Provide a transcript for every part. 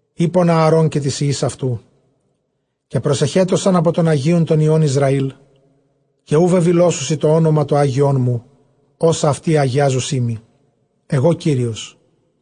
εἶπον Ἀαρὼν καὶ τοῖς υἱοῖς αὐτοῦ· καὶ προσεχέτωσαν ἀπὸ τῶν ἁγίων τῶν υἱῶν Ἰσραὴλ, καὶ οὐ βεβηλώσουσι τὸ ὄνομα τὸ ἅγιόν μου, ὅσα αὐτοὶ ἁγιάζουσί μοι· ἐγὼ Κύριος.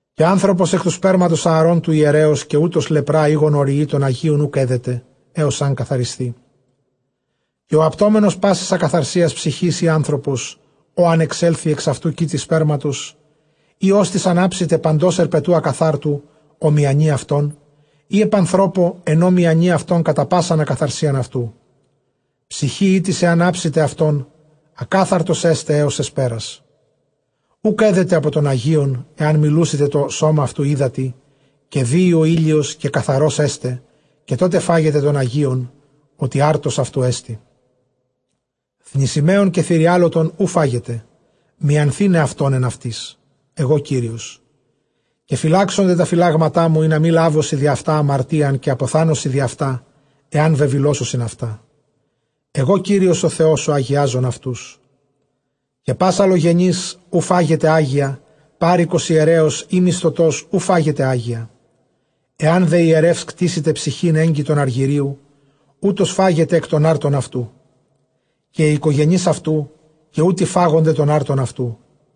Καὶ ἄνθρωπος ἐκ τοῦ σπέρματος Ἀαρὼν τοῦ ἱερέως, καὶ οὗτος λεπρᾷ ἢ γονοῤῥυεῖ, τῶν ἁγίων οὐκ ἔδεται, ἕως ἂν καθαρισθῇ· καὶ ὁ ἁπτόμενος πάσης ἀκαθαρσίας ψυχῆς, ἢ ἄνθρωπος ᾧ ἂν ἐξέλθῃ ἐξ αὐτοῦ κοίτη σπέρματος, ἢ ὅστις ἂν ἅψηται παντὸς ἑρπετοῦ ἀκαθάρτου, ὃ μιανεῖ αὐτὸν, ἢ ἐπʼ ἀνθρώπῳ, ἐν ᾧ μιανεῖ αὐτὸν κατὰ πᾶσαν ἀκαθαρσίαν αὐτοῦ· Ψυχὴ ἥτις ἐὰν ἅψηται αὐτῶν, ἀκάθαρτος ἔσται ἕως ἑσπέρας· οὐκ ἔδεται ἀπὸ τῶν ἁγίων, ἐὰν μὴ λούσηται τὸ σῶμα αὐτοῦ ὕδατι. Καὶ δύῃ ὁ ἥλιος, καὶ καθαρὸς ἔσται· καὶ τότε φάγεται τῶν ἁγίων, ὅτι ἄρτος αὐτοῦ ἐστι. Θνησιμαῖον καὶ θηριάλωτον οὐ φάγεται, μιανθῆναι αὐτὸν ἐν αὐτοῖς· ἐγὼ Κύριος. Καὶ φυλάξονται τὰ φυλάγματά μου, ἵνα μὴ λάβωσι διʼ αὐτὰ ἁμαρτίαν, καὶ ἀποθάνωσι διʼ αὐτὰ, ἐὰν βεβηλώσουσιν αὐτά· ἐγὼ Κύριος ὁ Θεὸς ὁ ἁγιάζων αὐτούς. Καὶ πᾶς ἀλλογενὴς οὐ φάγεται ἅγια· πάροικος ἱερέως, ἢ μισθωτὸς, οὐ φάγεται ἅγια. Ἐὰν δὲ ἱερεὺς κτήσηται ψυχὴν ἔγκτητον ἀργυρίου, οὗτος φάγεται ἐκ τῶν ἄρτων αὐτοῦ· καὶ οἱ οἰκογενεῖς αὐτοῦ, καὶ οὗτοι φάγονται τῶν ἄρτων αὐτοῦ.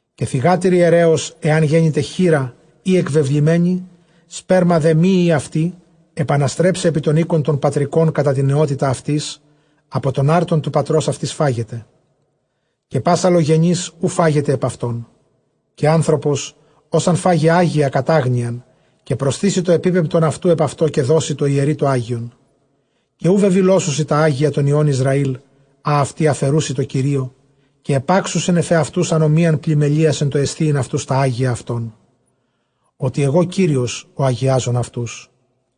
Καὶ θυγάτηρ ἱερέως ἐὰν γένηται χήρα ἢ ἐκβεβλημένη, σπέρμα δὲ μὴ ᾖ αὐτῇ, ἐπαναστρέψει ἐπὶ τὸν οἶκον τὸν πατρικὸν κατὰ τὴν νεότητα αὐτῆς· ἀπὸ τῶν ἄρτων τοῦ πατρὸς αὐτῆς φάγεται· καὶ πᾶς ἀλλογενὴς οὐ φάγεται ἀπʼ αὐτῶν. Καὶ ἄνθρωπος ὃς ἂν φάγῃ ἅγια κατʼ ἄγνοιαν, καὶ προσθήσει τὸ ἐπίπεμπτον αὐτοῦ ἐπʼ αὐτὸ, καὶ δώσει τῷ ἱερεῖ τὸ ἅγιον. Καὶ οὐ βεβηλώσουσι τὰ ἅγια τῶν υἱῶν Ἰσραὴλ, ἃ αὐτοὶ ἀφαιροῦσι τῷ Κυρίῳ, καὶ ἐπάξουσιν ἐφʼ ἑαυτοὺς ἀνομίαν πλημμελείας ἐν τῷ ἐσθίειν αὐτοὺς τὰ ἅγια αὐτῶν, ὅτι ἐγὼ Κύριος ὁ ἁγιάζων αὐτούς.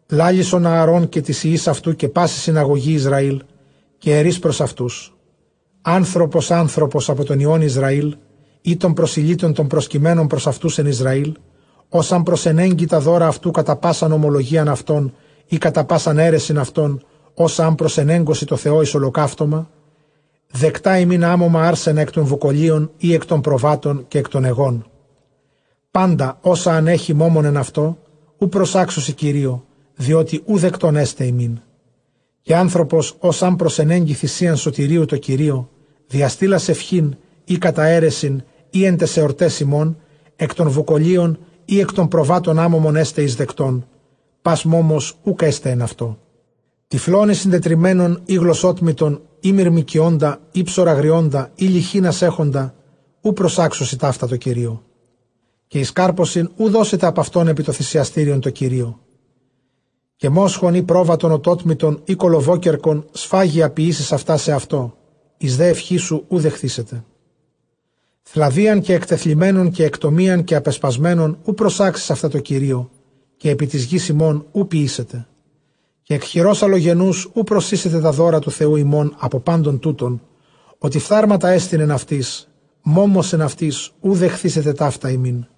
λάλησον Ἀαρὼν καὶ τοῖς υἱοῖς αὐτοῦ, καὶ πάσῃ συναγωγῇ Ἰσραὴλ, καὶ ἐρεῖς πρὸς αὐτοὺς, ἄνθρωπος ἄνθρωπος ἀπὸ τῶν υἱῶν Ἰσραὴλ, ἢ τῶν προσηλύτων τῶν προσκειμένων πρὸς αὐτοὺς ἐν Ἰσραὴλ, ὃς ἂν προσενέγκῃ τὰ δῶρα αὐτοῦ κατὰ πᾶσαν ὁμολογίαν αὐτῶν, ἢ κατὰ πᾶσαν αἵρεσιν αὐτῶν, ὅσα ἂν προσενέγκωσι τῷ Θεῷ εἰς ὁλοκαύτωμα. Δεκτὰ ὑμῖν ἄμωμα ἄρσενα ἐκ τῶν βουκολίων, ἢ ἐκ τῶν προβάτων, καὶ ἐκ τῶν αἰγῶν. Πάντα ὅσα ἂν ἔχῃ μῶμον ἐν αὐτῷ οὐ προσάξουσι Κυρίῳ, διότι οὐ δεκτὸν ἔσται ὑμῖν. Καὶ ἄνθρωπος ὃς ἂν προσενέγκῃ θυσίαν σωτηρίου τῷ Κυρίῳ, διαστείλας εὐχὴν ἢ κατὰ αἵρεσιν ἢ ἐν ταῖς ἑορταῖς ὑμῶν, ἐκ τῶν βουκολίων ἢ ἐκ τῶν προβάτων, ἄμωμον ἔσται εἰσδεκτὸν, πᾶς μῶμος οὐκ ἔσται ἐν αὐτῷ. Τυφλὸν ἢ συντετριμμένον ἢ γλωσσότμητον ἢ μυρμηκιῶντα ἢ ψωραγριῶντα ἢ λειχῆνας ἔχοντα, οὐ προσάξουσι ταῦτα τῷ Κυρίῳ, καὶ εἰς κάρπωσιν οὐ δώσετε ἀπʼ αὐτῶν ἐπὶ τὸ θυσιαστήριον τῷ Κυρίῳ. Καὶ μόσχον ἢ πρόβατον ὠτότμητον ἢ κολοβόκερκον, σφάγια ποιήσεις αὐτὰ σεαυτῷ, εἰς δὲ εὐχήν σου οὐ δεχθήσεται. Θλαδίαν καὶ ἐκτεθλιμμένον καὶ ἐκτομίαν καὶ ἀπεσπασμένον, οὐ προσάξεις αὐτὰ τῷ Κυρίῳ, καὶ ἐπὶ τῆς γῆς ὑμῶν οὐ ποιήσετε. Καὶ ἐκ χειρὸς ἀλλογενοῦς οὐ προσοίσετε τὰ δῶρα τοῦ Θεοῦ ὑμῶν ἀπὸ πάντων τούτων· ὅτι φθάρματά ἐστιν ἐν αὐτοῖς, μῶμος ἐν αὐτοῖς οὐ δεχθήσεται ταῦτα ὑμῖν.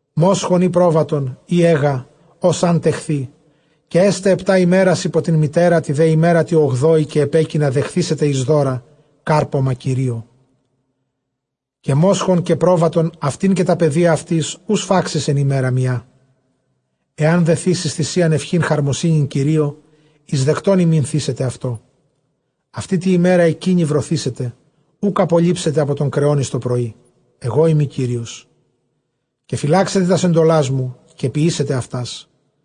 μόσχον ἢ πρόβατον ἢ αἶγα, ὡς ἂν τεχθῇ, καὶ ἔσται ἑπτὰ ἡμέρας ὑπὸ τὴν μητέρα, τῇ δὲ ἡμέρᾳ τῇ ὀγδόῃ καὶ ἐπέκεινα δεχθήσεται εἰς δῶρα, κάρπωμα Κυρίῳ. Καὶ μόσχον καὶ πρόβατον, αὐτὴν καὶ τὰ παιδία αὐτῆς, οὐ σφάξεις ἐν ἡμέρᾳ μιᾷ. Ἐὰν δὲ θύσῃς θυσίαν εὐχὴν χαρμοσύνης Κυρίῳ, εἰσδεκτὸν ὑμῖν θύσετε αὐτό. Αὐτῇ τῇ ἡμέρᾳ ἐκείνῃ βρωθήσεται· οὐκ ἀπολείψετε ἀπὸ τῶν κρεῶν εἰς τοπρωΐ· ἐγώ εἰμι Κύριος. Καὶ φυλάξετε τὰς ἐντολάς μου, καὶ ποιήσετε αὐτάς.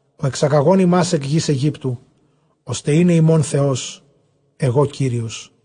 ὁ ἐξαγαγὼν ὑμᾶς ἐκ γῆς Αἰγύπτου, ὥστε εἶναι ὑμῶν Θεός· ἐγὼ Κύριος.